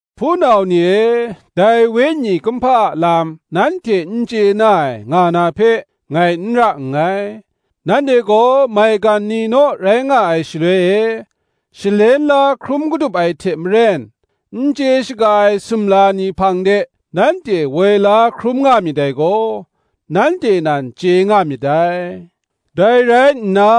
Hpunau ni e, dai wenyi kumhpa a lam nanhte n chye na ai nga na hpe, ngai n ra nngai. Nanhte gaw maigan ni naw rai nga ai shaloi e, shalen la hkrum kadup ai hte maren, n chye shaga ai sumla ni hpang de nanhte woi la hkrum nga myit dai gaw, nanhte nan chye nga myit dai. Dai rai nna,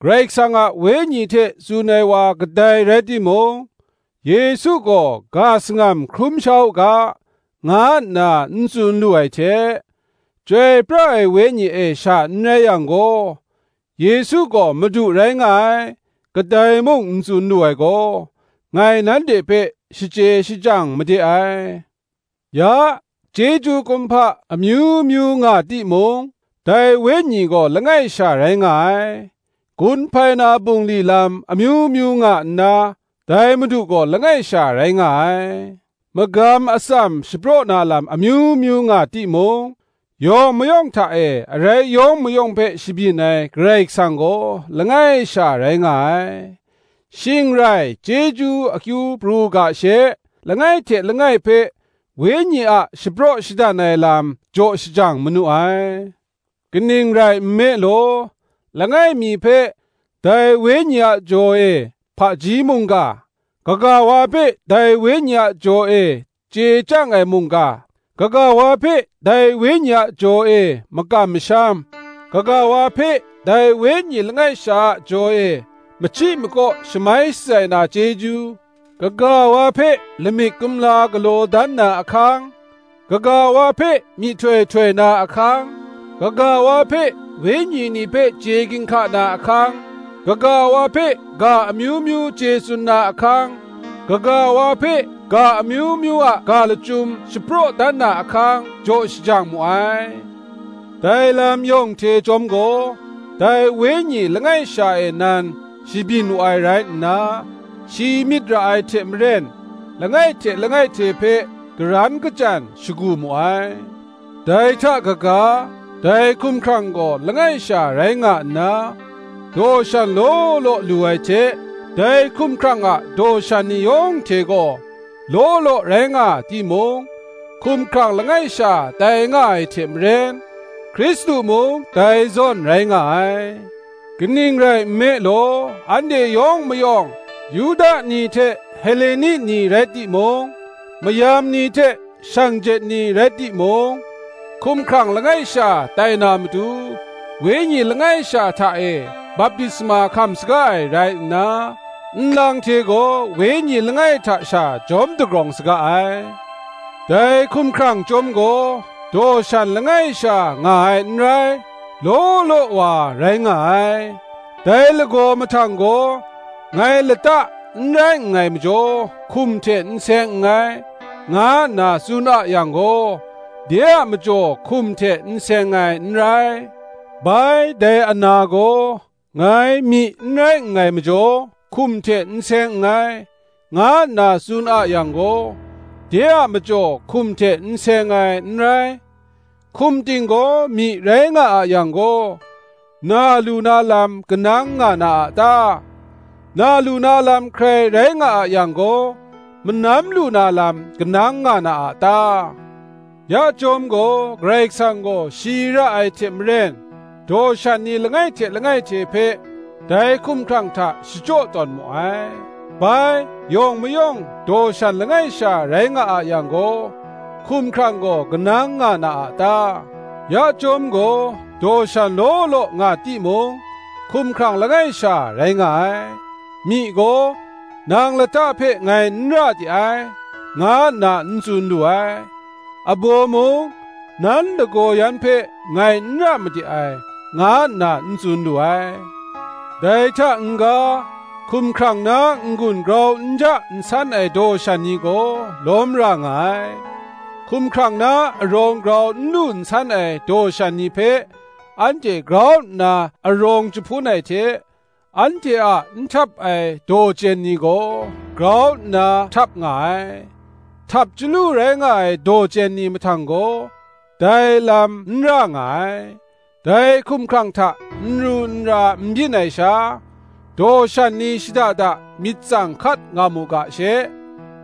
Karai Kasang a Wenyi hte tsun ai wa kadai rai timung, Yesu gaw “ga sangam hkrum sha u ga” nga nna n tsun lu ai hte, Chyoi pra ai Wenyi e sha n rai yang gaw, “Yesu gaw Madu rai nga ai” kadai mung n tsun lu ai gaw, ngai nanhte hpe shachye shachyang made ai. Ya, chyeju kumhpa amyu myu nga timung, dai Wenyi gaw langai sha rai nga ai; gun hpai na bungli lam amyu myu nga nna, dai Madu gaw langai sha rai nga ai; magam atsam shapraw na lam amyu myu nga timung, yawng mayawng hta e arai yawng mayawng hpe shabyin ai Karai Kasang gaw langai sha rai nga ai. Shing rai Chyeju akyu pru u ga she, langai hte langai hpe Wenyi a shapraw shadan ai lam jaw shajang manu ai. Kaning rai nme law, langai mi hpe, dai Wenyi a jaw e, hpaji mungga; kaga wa hpe dai Wenyi a jaw e chye chyang ai mungga; kaga wa hpe dai Wenyi a jaw e makam masham; kaga wa hpe, dai Wenyi langai sha a jaw e, machyi makaw shamai shatsai na chyeju; kaga wa hpe lamik kumla galaw dan na ahkang; kaga wa hpe myihtoi htoi na ahkang; kaga wa hpe wenyi ni hpe chye ginhka na ahkang; kaga wa hpe ga amyu myu chye tsun na ahkang; kaga wa hpe ga amyu myu a ga lachyum shapraw dan na ahkang, jaw shajang mu ai: dai lam yawng hte chyawm gaw, dai Wenyi langai sha e nan shabyin wu ai rai nna, shi myit ra ai hte maren, langai hte langai hte hpe karan kachyan shagu mu ai. Dai hta kaga, dai hkumhkrang gaw langai sha rai nga nna, daw shan law law lu ai hte, dai hkumhkrang a daw shan ni yawng hte gaw law law rai nga timung, hkumhkrang langai sha tai nga ai hte maren, Hkristu mung dai zawn rai nga ai. Kaning rai nme law anhte yawng mayawng, Yuda ni hte Heleni ni rai timung, mayam ni hte shanglawt ni rai timung, hkumhkrang langai sha tai na matu, Wenyi langai sha hta e baptisma hkam saga ai rai nna, nlang hte gaw Wenyi langai hta sha jawm dagrawng saga ai. Dai hkumhkrang chyawm gaw, daw shan langai sha nga ai n rai, law law wa rai nga ai. Dai lagaw mahtang gaw, Ngai lata n rai nngai majaw hkum hte n seng nngai, nga nna tsun a yang gaw, de a majaw hkum hte n seng ai, n rai. Bai dai ana gaw, Ngai myi n rai nngai majaw hkum hte n seng nngai, nga nna tsun a yang gaw, de a majaw hkum hte seng ai, n rai. Hkum ting gaw myi rai nga a yang gaw, na lu na lam kanang nga na a ta? na lu na lam hkrai rai nga a yang gaw, manam lu na lam kanang nga na a ta? Ya chyawm gaw, Karai Kasang gaw shi ra ai hte maren, daw shan ni langai hte langai hte hpe dai hkumhkrang hta shachyaw tawn mu ai. Bai, yawng mayawng daw shan langai sha rai nga a yang gaw, hkumhkrang gaw kanang nga na a ta? Ya chyawm gaw daw shan law law nga timung, hkumhkrang langai sha rai nga ai. Myi gaw, Nang lata hpe ngai n ra de ai, nga nna n tsun lu ai; abaw mung, Nan lagaw yan hpe ngai n ra made ai, nga nna n tsun lu ai. Dai hta n-ga, hkumhkrang na n-gun grau n ja nsan ai daw shan ni gaw lawm ra nga ai: hkumhkrang na arawng grau n lu nsan ai daw shan ni hpe anhte grau nna arawng jahpun ai hte, anhte a n htap ai daw chyen ni gaw, grau nna htap nga ai; htap chyalu rai nga ai daw chyen ni mahtang gaw, dai lam n ra nga ai: dai hkumhkrang hta nru nra n byin ai sha, daw shan ni shada da myit tsang hkat nga mu ga she,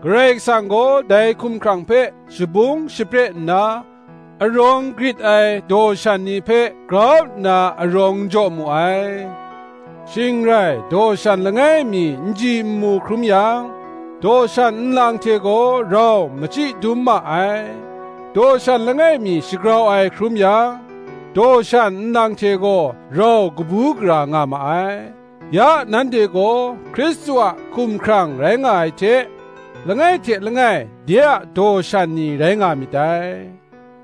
Karai Kasang gaw dai hkumhkrang hpe shabung shapre nna, arawng grit ai daw shan ni hpe grau nna arawng jaw mu ai. Shing rai daw shan langai mi nji nmu hkrum yang, daw shan nlang hte gaw rau machyi dum ma ai; daw shan langai mi shagrau ai hkrum yang, daw shan nlang hte gaw rau kabu gara nga ma ai. Ya nanhte gaw Hkristu a hkumhkrang rai nga ai hte, langai hte langai de a daw shan ni rai nga myit dai.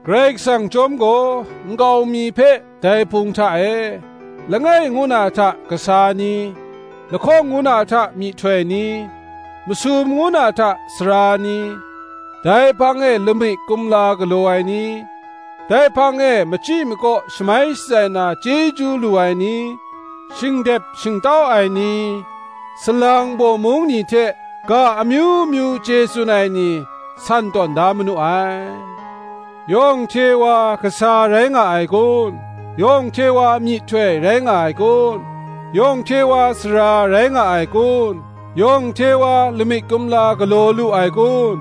Karai Kasang chyawm gaw nkau mi hpe dai Hpung hta e, langai ngu na hta kasa ni, lahkawng ngu na hta myihtoi ni, masum ngu na hta sara ni, dai hpang e lamik kumla galaw ai ni, dai hpang e machyi makaw shamai shatsai na chyeju lu ai ni, shingdep shingtau ai ni, salang bawmung ni hte ga amyu myu chye tsun ai ni, san tawn da manu ai. Yawng hte wa kasa rai nga ai kun? yawng hte wa myihtoi rai nga ai kun? yawng hte wa sara rai nga ai kun? yawng hte wa lamik kumla galaw lu ai kun?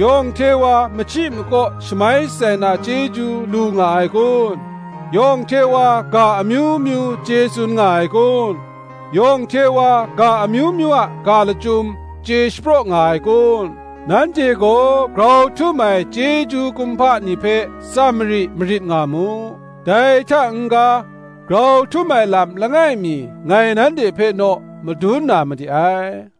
yawng hte wa machyi makaw shamai shatsai na chyeju lu nga ai kun? yawng hte wa ga amyu myu chye tsun nga ai kun? yawng hte wa ga amyu myu a ga lachyum chye shapraw nga ai kun? Nanhte gaw grau htum ai chyeju kumhpa ni hpe tsam mari marit nga mu. Dai hta n-ga grau htum ai lam langai mi ngai nanhte hpe naw madun na made ai.